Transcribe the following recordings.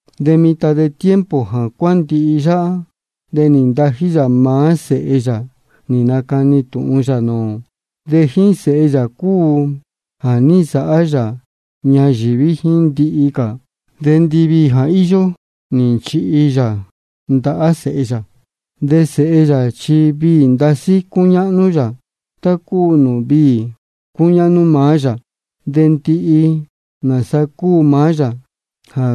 De mitan de tiempo jā cuándihi yáhá de nī ntají yā maá Sēhe yā nī nacani yā tūhun nūū ō. De jíín Sēhe yā cúu jā ní nsāhá yā ñayīví jíín ndihi cā, de ndiviī jā íyó nī nchihi yā ndahá Sēhe yā. De Sēhe yā chi viī ndasí cúñáhnú yā, tá cúu nūū viī cúñáhnú maá yā. De ndihi nāsa cúu maá yā jā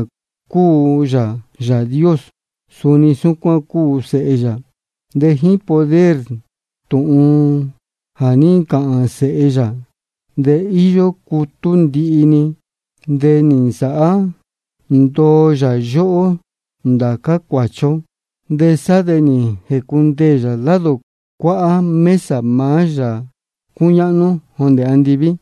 cúu yā Yāā Dios, suni súcuán cúu Sēhe yā. De jíín poder tūhun jā ní ncāhān Sēhe yā de íyó cutú ndihi-ni. De nī nasāhá ndoo yā yóhó ndācá cuāchi ó, de sá de nī jēcundeē yā lado cuáhá mesa maá Yāā cúñáhnú jondē andiví.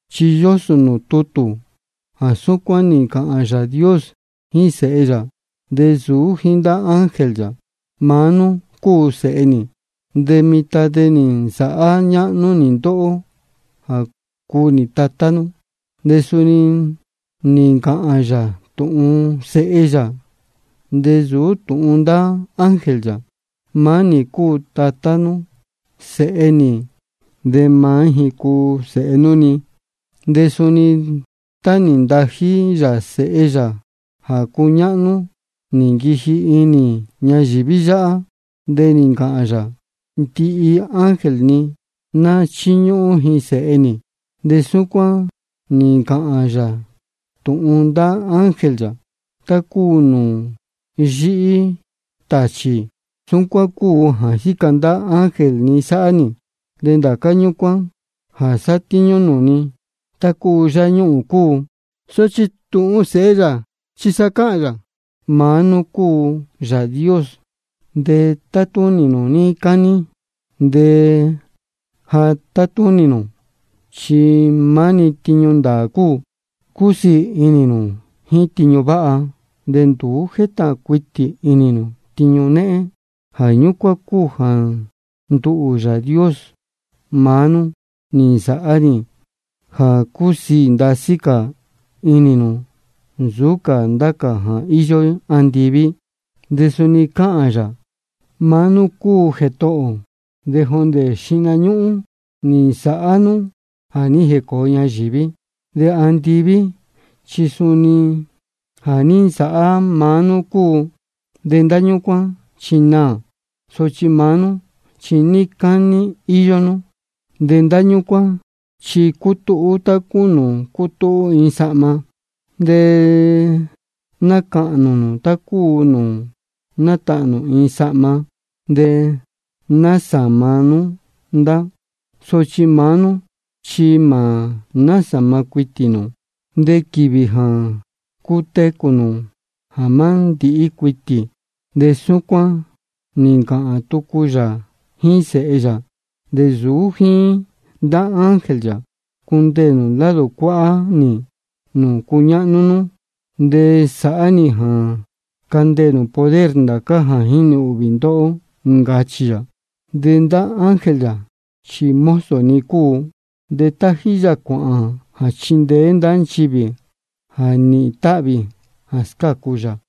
Chi yósō nūū tutū jā súcuán nī ncāhān Yāā Dios jíín Sēhe yā, de nsūú jíín ndá ángel yā: Maá nú cúu Sēhe nī, de mitan de nī nsāhá ñáhnú nī ndóhó jā cúu nī Tatá nú. De suni nī ncāhān yā tūhun Sēhe yā, de nsūú tūhun ndá ángel yā: Maá nī cúu Tatá nūū Sēhe nī, de maá ji cúu Sēhe nūū ni. De suni tá nī ntají yā Sēhe yā jā cúñáhnú, nī nquiji inī ñayīví yáhá, de nī ncāhān yā: Ndihi ángel ni ná chíñúhún ji Sēhe nī. De súcuán nī ncāhān yā tūhun ndá ángel yā: Tá cúu nūū yíhí tāchī, súcuán cúu jā jíca ndá ángel ni sáhá nī, de ndācá ñúcuán jā sátíñú nūū ni, tá cúu yáñuhūn cúu. Sochi tūhun Sēhe yā chi sa cáhān yā: Maá nú cúu Yāā Dios, de tatúnī nū níí cání, de jā tátúnī nū chi maá-ni tiñu ndāā cúu. Cúsiī inī nū jíín tiñu váha, de nduú jétahān cuitī inī nū tiñu néhén. Jā ñúcuán cúu jā nduhū, Yāā Dios maá nú, nī nsāhá nī jā cúsiī ndasí cā inī nū nsūú cā ndá cā jā íyó andiví. De suni cáhān yā: Maá nú cúu Jētohō, de jondē xihna ñúhún nī nsāhá nú jā ní jēcōo ñayīví. De andiví chi suni jā ní nsāhá maá nú cúu. De ndá ñúcuán chi naā, sochi maá nú chi níí cání íyó nú. De ndá ñúcuán chi cutúhú tá cúu nūū cútúhú iin sahma, de nacahnū nū tá cúu nūū nátahnū iin sahma, de nasāma nú ndá. Sochi maá nú chi mā násāma cuitī nū, de quīvī jā cutecū nū mā ndīhí cuitī. De súcuán nī ncāhān tucu yā jíín Sēhe yā, de nsūú jíín ndá ángel yā: Cundeē nū lado cuáhá nī nūū cuñáhnú nú, de sāhá nī jā candeē nū poder ndācá jā jínī ūhvī ndóhó. Ncachī yā. De ndá ángel yā chi mozo-ni cúu, de tájí yā cuāhān jā chíndeé ndá nchivī jā nīhīn táhvī jā scácu yā.